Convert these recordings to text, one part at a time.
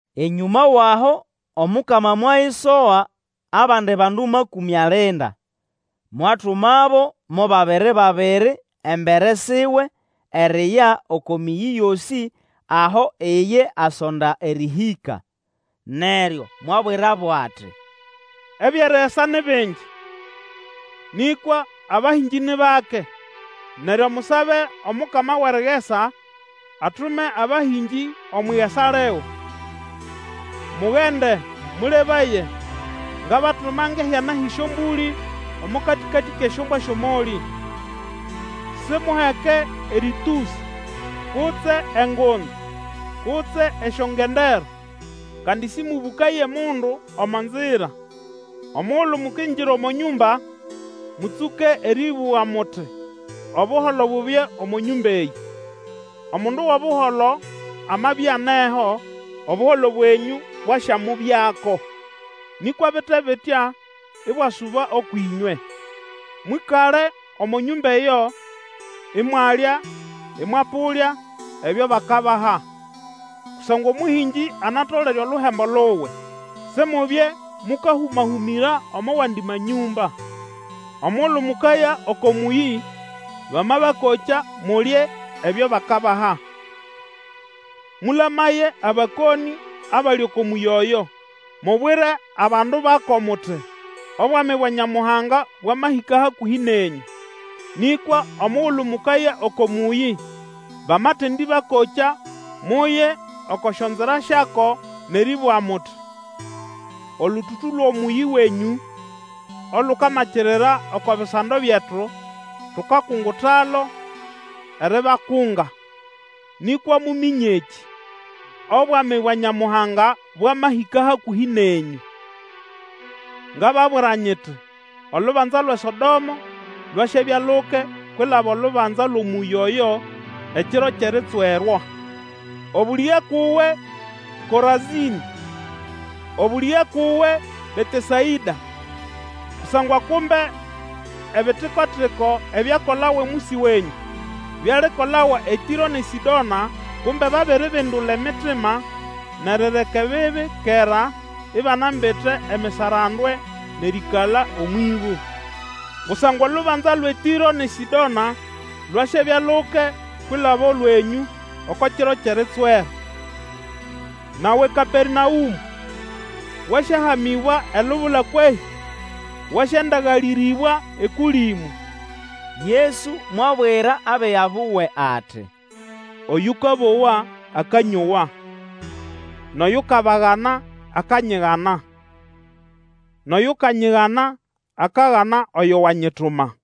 Enyũma wʼaho, Omukama mwayisoga abandi bandu makũmĩ alinda, mwatumabo mo babiri babiri embere siwe, eriya oko mĩyĩ yosĩ aho iye asonda erĩhĩka. Neryo mwabwirabo ati, Ebyʼerigesa ni bingi, nĩkwa abahĩngĩ ni bake. Neryo musabe Omukama wʼerigesa atume abahĩngĩ omwʼigesa liwe. Mugende, mũlebaye, ngabatuma ngʼehyana hyʼesyombũlĩ omo katĩkatĩ kʼesyombwa syʼomolĩ. Simuheke erĩtũsĩ, kutse engunza, kutse esyongendero; kandi sĩmũbũkaye mundu omo nzira. Omugulu mukingira omo nyũmba, mũtsũke erĩbũga, muti, Obuholo bubye omo nyũmba eyĩ! Omundu wʼobuholo amabya aneho, Obuholo bwenyũ bwasyamubyako; nĩkwa bite bitya, ibwasuba ũkwʼĩnywe. Mwĩkale omo nyũmba eyo, imwalya ĩmwapũlya ebyo bakabaha; kusangwa omũhĩngĩ anatolere oluhembo luwe. Simubye mũkahũma-hũmĩra omo wandi manyũmba. Omugulu mukaya oko mũyĩ, bamabakokya, mulye ebyo bakabaha. Mũlamaye abakonĩ abali oko mũyĩ oyo, mubwire abandu bako muti, Obwami bwa Nyamuhanga bwamahĩka hakũhĩ nenyũ. Nĩkwa omugulu mukaya oko mũyĩ, bamatendĩbakokya muye oko syonzira syako nʼerĩbũga muti, Olũtũtũ lwʼomũyĩ wenyũ olukamakirira oko bisando byetu, tukakungutalo eribakunga; nĩkwa muminye ekĩ: obwami bwa Nyamuhanga bwamahĩka hakũhĩ nenyũ. Ngababwira nyiti, olubanza lwʼeSodomo lwasyabya luke kwilaba olubanza lwʼomũyĩ oyo ekiro kyʼeritswerwa. Obũlĩge ukʼuwe Korazĩnĩ! Obũlĩge ukʼuwe Betesaĩda! Kusangwa kumbe ebitiko-tiko ebyakolawa omwisi wenyũ, byalikolawa eTĩro nʼeSĩdona, kumbe babiribindula emitima nʼerireka ebibi kera ibanambite emisarandwe nʼerĩĩkala omwʼĩbũ! Kusangwa olubanza lwʼeTĩro nʼeSĩdona lwasyabya luke kwilaba olwenyũ oko kiro kyʼeritswera. Nawe Kapemaũmũ, wasyahamĩbwa elubula kwehĩ? Wasyandagalĩrĩbwa eKũlĩmũ! Yesu mwabwira abiga buwe ati, Oyũkabowa, akanyowa; nʼoyukabagana, akanyigana; nʼoyukanyigana, akagana oyo wanyituma.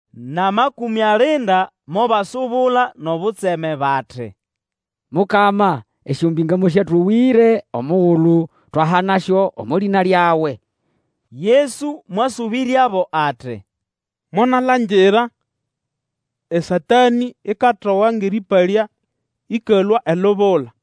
NʼAmakũmĩ alinda mobasubula nʼobutseme bati, Mukama, esyombĩnga mosyatowĩre omugulu twahanasyo omo lĩna lyawe! Yesu mwasũbĩryabo ati, Monalangira eSatanĩ ikatoga ngʼerĩpalya ĩkalũa elubula.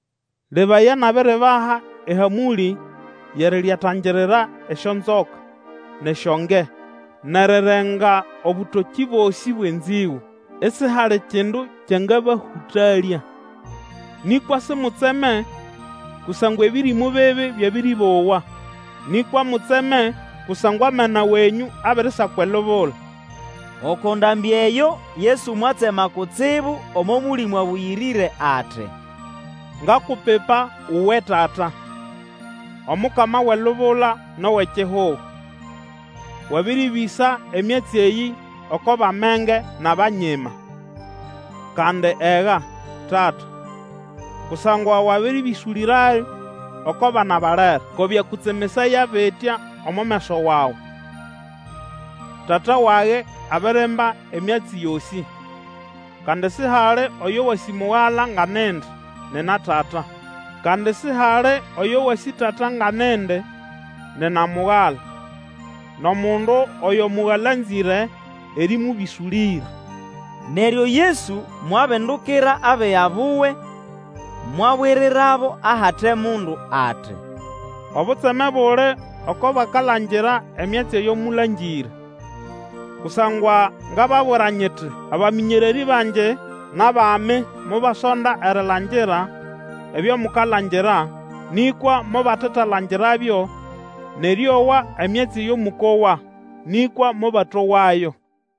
Lebaya, nabiribaha ehamũlĩ yʼeriryatangirira esyonzoka, nʼesyonge, nʼerirenga obũtokĩ bosĩ bwʼenzĩgũ, isihali kindu kyangabahũtalya. Nĩkwa simutseme kusangwa ebĩrĩmũ bibi byabĩrĩbowa, nĩkwa mutseme kusangwa amena wenyũ abirisakwa elubula. Oko ndambĩ eyo Yesu mwatsema kutsibu omo Mũlĩmũ Abũyĩrĩre ati, Ngakupipa uwe Tata, Omukama wʼelubula nʼowʼekihugo, wabĩrĩbĩsa emyatsi eyĩ oko bʼamenge nʼabanyima. Kandi Ega, Tata, kusangwa wabĩrĩbĩsũlĩrayo oko bana balere; ko byakũtsemesaya bitya omo meso wawe. Tata wage abirimba emyatsi yosĩ, kandi sihali oyo wasĩ Mugala nga nindi, nina Tata; kandi sihali oyo wasĩ Tata nga nindi, nina Mugala, nʼomundu oyo Mugala anzĩre erĩmũbĩsũlĩra. Neryo Yesu mwabindukira abiga buwe mwabwirirabo ahate mundu ati, Obutseme buli oko bakalangira emyatsi eyo mũlangĩre! Kusangwa ngababwira nyiti, abamĩnyererĩ bangi nʼabami mobasonda erilangira ebyo mukalangira, nĩkwa mobatalangirabyo, nʼerĩowa emyatsi eyo mũkowa, nĩkwa mobatowayo.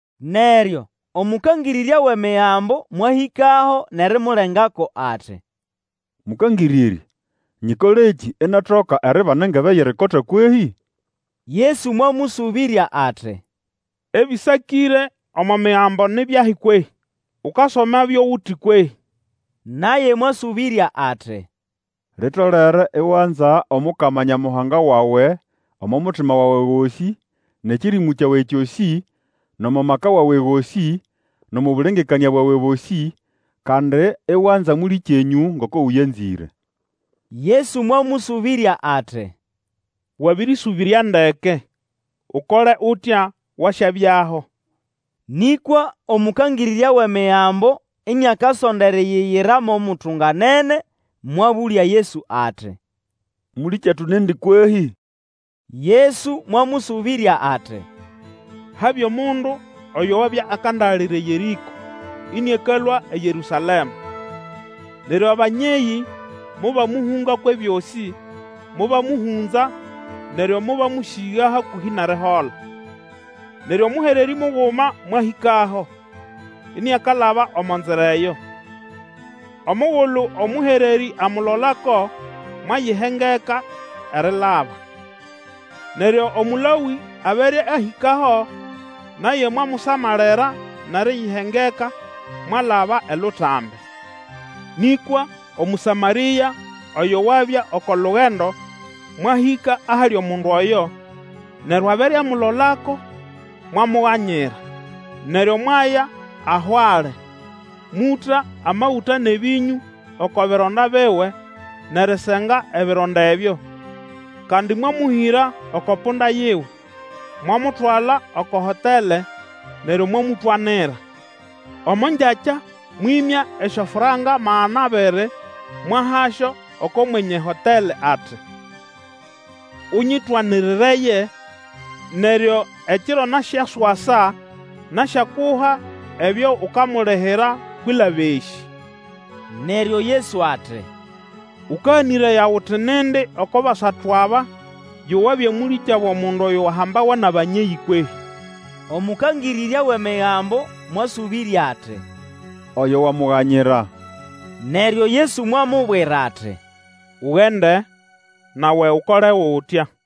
Neryo omũkangĩrĩrya wʼEmigambo mwahĩkaho nʼerimulengako ati, Mũkangĩrĩrya, nyikolekĩ inatoka eribana engebe yʼerikota kwehĩ? Yesu mwamũsũbĩrya ati, Ebĩsakĩre omo Migambo ni byahi kwehĩ? Ukasomabyo uti kwehĩ? Naye mwasũbĩrya ati, Litolere iwanza Omukama Nyamuhanga wawe omo mutima wawe gosĩ, nʼekĩrĩmũ kyawe kyosĩ, nʼomo maka wawe gosĩ, nʼomo bũlengekanĩa bwawe bosĩ; kandi iwanza mũlĩkyenyũ ngoko ũyanzĩre. Yesu mwamũsũbĩrya ati, Wabĩrĩsũbĩrya ndeke; Ukole utya, wasyabyaho. Nĩkwa omũkangĩrĩrya wʼEmigambo iniakasonda eriyiyira mo mutunganene, mwabũlya Yesu ati, Mũlĩkyetu nindi kwehĩ? Yesu mwamũsũbĩrya ati. Habya omundu oyo wabya akandagalira eYerĩko ĩnĩakalũa eYerũsalema. Neryo abanyeyĩ mobamũhũnga kwʼebyosĩ, mobamũhũnza neryo mobamũsĩga hakũhĩ nʼerihola. Neryo mũhererĩ muguma mwahĩkaho, iniakalaba omo nzira eyo. Omugulu omũhererĩ amulolako, mwayihengeka erilaba. Neryo Omũlawĩ abere ahĩkaho, naye mwamusamalira nʼeriyihengeka, mwalaba elutambi. Nĩkwa Omũsamarĩa, oyo wabya oko lugendo, mwahĩka ahali omundu oyo, neryo abere amulolako, mwamuganyira. Neryo mwaya aho ali, mũta amagũta nʼebĩnyũ oko bironda biwe nʼerisenga ebironda ebyo; kandi mwamũhĩra oko punda yiwe, mwamutwala oko hotele neryo mwamũtwanira. Omo ngyakya mwĩmya esyofranka magana abiri mwahasyo oko mwenye hotele ati, Ũnyĩtwanirireye, neryo ekiro nasyaswasa nasyakuha ebyo ukamulihira kwilaba esĩ. Neryo Yesu ati, Ũkaganĩraya uti nindi oko basatu aba yo wabya mũlĩkyabo mundu oyo wahambawa nʼabanyeyĩ kwehĩ? Omũkangĩrĩrya wʼEmigambo mwasũbĩrya ati, Oyo wamuganyira. Neryo Yesu mwamubwira ati, Ugende, nawe Ukole utya.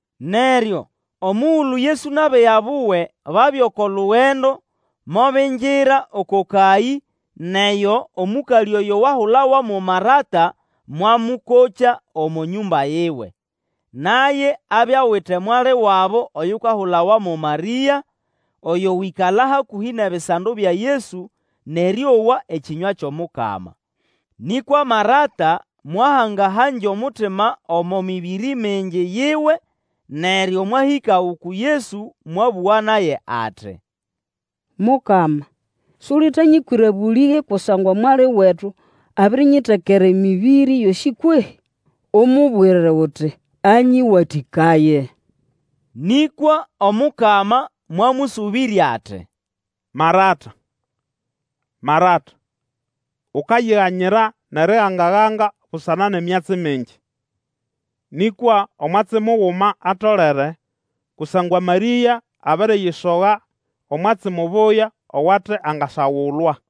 Neryo omugulu Yesu nʼabiga buwe babya oko lugendo, mobingira oko kayĩ nʼeyo omũkalĩ oyo wahulawa mo Marata mwamũkokya omo nyũmba yiwe. Naye abya awite mwali wabo oyukahulawa mo Marĩa, oyo wĩkala hakũhĩ nʼebisando bya Yesu, nʼerĩowa ekĩnywa kyʼomukama. Nĩkwa Marata mwahanga-hangya omutima omo mĩbĩrĩ mingi yiwe; neryo mwahĩka uku Yesu mwabũga naye ati, Mukama, sulitanyĩkwĩra bũlĩge kusangwa mwali wetu abirinyitekera emĩbĩrĩ yosĩ kwehĩ? Umubwire uti anyĩwatĩkaye! Nĩkwa Omukama mwamũsũbĩrya ati, Marata, Marata! Ukayiganyira nʼeriganga-ganga busana nʼemyatsi mingi; nĩkwa omwatsi muguma atolere, kusangwa Marĩa abiriyisoga omwatsi mubuya owate angasagulwa.